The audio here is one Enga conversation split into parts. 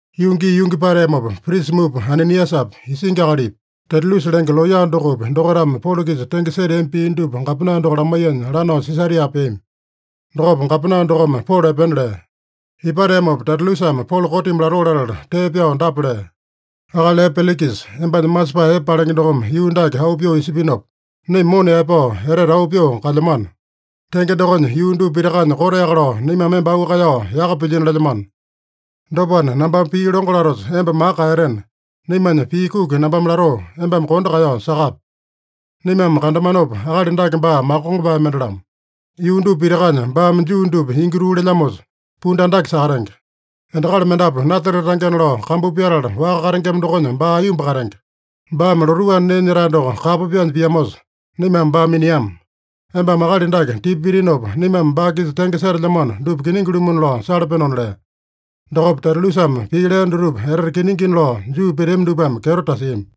Yuu gii yungi pateamopa prisa mupa Ananiasapi, isingi akalipi, Tetulusa lenge looya dokopi, dokaitame Polo-kisa tenge seteami pii dupa gapena doko lamaiyanya, lanao Sisaria peami. Dokopa gapena dokome Polo epena lea. Ipateamopa Tetulusame Polo kotimi latoo latala tee pyao dapa lea: “Akali epe Pelikisa, embanya masepae epe palenge dokome yuu dake auu pyoo isipinopa, naima mona yaepao etete auu pyoo kalyamano. Tenge dokonya, yuu dupa pitakanya koteaka lao naimame emba auu kaeyao yaka pilyino lelyamano. Dopana, nambame pii longo latosa emba maka kaeyatena, naimanya pii kuki nambame latoo, embame kondo kaeyao sakape. Naimame kandamanopa, akali dake baa makongopae mende-lamo. Yuu dupa pitakanya baame Juu dupa ingi tuu lelyamosa, pundu andake sakatenge. Endakali mendapu Nasarete tangena lao kambu pyatala waka katengema dokonya baa aiyomba katenge. Baame lotuu anda nee nyetae doko kapo pyaanya piamosa, naimame baa miniama. Embame akali dake tipa pitinopa, naimame baa-kisa tenge setelyamano dupa kiningi-lumuna lao salapenona” lea. Dokopa Tetulusame pii lea dutupa etete kiningina lao Juu peteami dupame kyeto tasiami.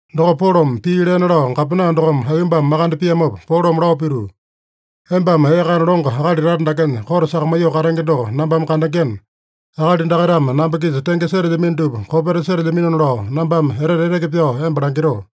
Dokopa Polome pii lena lao gapena dokome aiyombame makande piamopa, Polome lao pituu, “Embame ee kana longo akali tata dakenya kote sakamaiyoo katenge doko nambame kandengena, akali dakaitame namba-kisa tenge setelyamino dupa kopeta setelyaminona lao nambame etete eteke pyao emba langitoo.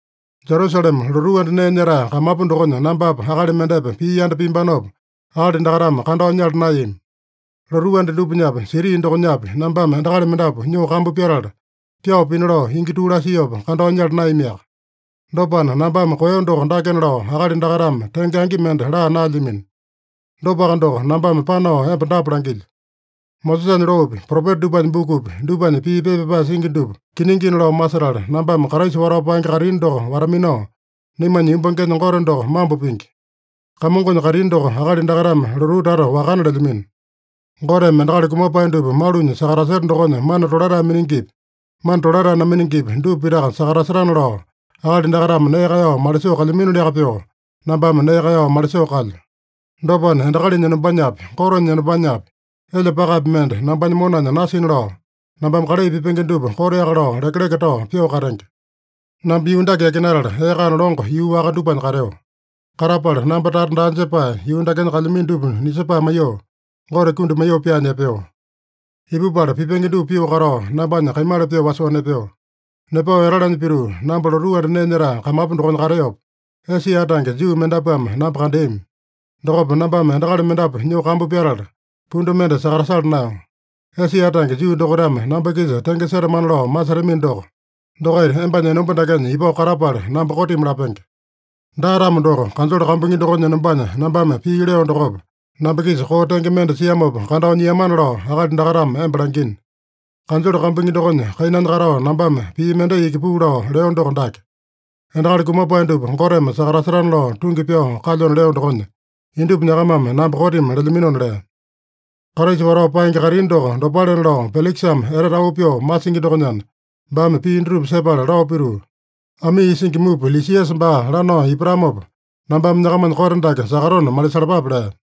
Jerusalema lotuu anda nee nyetae kamapu dokonya nambapa akali mendepa pii yanda piambanopa, akali dakaitame kandao nyala naeyami. Lotuu anda dupanyapi, siti dokonyapi, nambame endakali mendapu nyoo kambu pyatala, pyao pina lao ingi tuu lasiopa kandao nyala naeyamiaka. Dopana nambame koeyo doko dakena lao akali dakaitame tenge angi mende laa naelyamino. Dopaka doko, nambame panao emba dapa langilyo: Mosesanya loopi, Propeta dupanya bukupi, dupanya pii pepa pyapae singi dupa kiningina lao masetala, nambame Kraisa watao paenge kaitini doko wata-minao, naimanya yumbangenya Gote doko mambo pingi. Kamongonya kaitini doko akali dakaitame lotuu tata wakana lelyamino. Goteme endakali kumapae dupa malunya sakataseta dokonya mana tolatae miningipi, mana tolatae naminingipi, dupa pitaka sakatasetana lao, akali dakaitame nee kaeyao malisoo kalyaminoliaka pyoo, nambame nee kaeyao malisoo kalyo. Dopana, endakalinya enombanyapi, Gotenya enombanyapi, elya pakapi mende nambanya monanya nasina lao, nambame kalai pipenge dupa koteaka lao lekeleke tao pyoo katenge. Namba yuu dake yakinatala, ee kana longo yuu waka dupanya kateo. Katapala namba tata daa jepae, yuu dakenya kalyamino dupa nisepae maiyoo, Gote kundi maiyoo pyaanya epeo. Ipupala pipenge dupa pyoo katao nambanya kaimala pyoo wasoo nepeo. Nepao etalanya pituu, namba lotuu anda nee nyetae kamapu dokonya kateopa, Esia tange Juu mendapuame namba kandeami. Dokopa nambame endakali mendapu nyoo kambu pyatala, pundu mende sakatasala naeyo. Esia tange Juu dokaitame namba-kisa tenge setamana lao masetamino doko, dokaita embanya enomba dakenya ipao katapala namba kotimi lapenge. Daa-tamo doko, kanjole kambuingi dokonya enombanya nambame pii leo dokopa, namba-kisa koo tenge mende siamopa kandao nyiamana lao akali dakaitame emba langina. Kanjole kambuingi dokonya kainanya katao nambame pii mendai iki puu lao leo doko dake: ‘Endakali kumapae dupa Goteme sakatasetana lao tungi pyao kalyona leo dokonya, indupa nyakamame namba kotimi lelyaminona’” lea. Kraisa watao paenge kaitini doko dopalena lao Pelikisame etete auu pyoo masingi dokonyana, baame pii dutupa sepala lao pituu, “Amii isingi mupa Lisiasa baa lanao ipatamopa, nambame nyakamanya kote dake sakatona malisalapape” lea.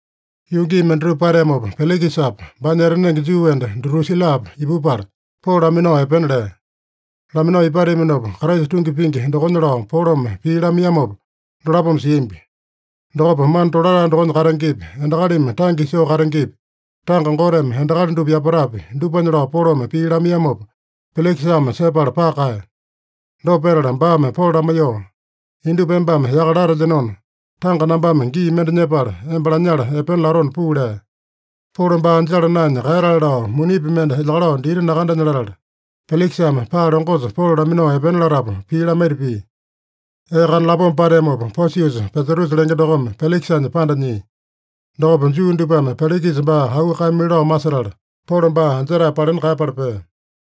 Yuu gii mendatupa pateamopa Pelikisapa, baanya etanenge Juu enda Dutusilapa ipupala, Polo laminao epena lea. Laminao ipateaminopa, Kraisa tungi pingi dokonya lao Polome pii lamaiyamopa dolapome siambi. Dokopa mana tolatae dokonya katengepi, endakalimi tange isoo katengepi, tanga Goteme endakali dupa yapatapi, dupanya lao Polome pii lamaiyamopa, Pelikisame sepala paka kaeya. Dopa petala baame Polo lamaiyoo, “Indupa embame yaka latelyenona, tanga nambame gii mende nyepala, emba lanyala epena latona puu” lea. Polo baa anjala naenya kaeyatale lao, munipi mende elyakalao dita nakandenya latala, Pelikisame paa longosa Polo laminao epena latapu pii lamaita pia. Ee kana lapoma pateamopa, Posiusa Pesatusa lenge dokome Pelikisanya panda nyia. Dokopa Juu dupame Pelikisa baa auu kaeyamili lao masetala, Polo baa anjetae palena kaeyapala pea.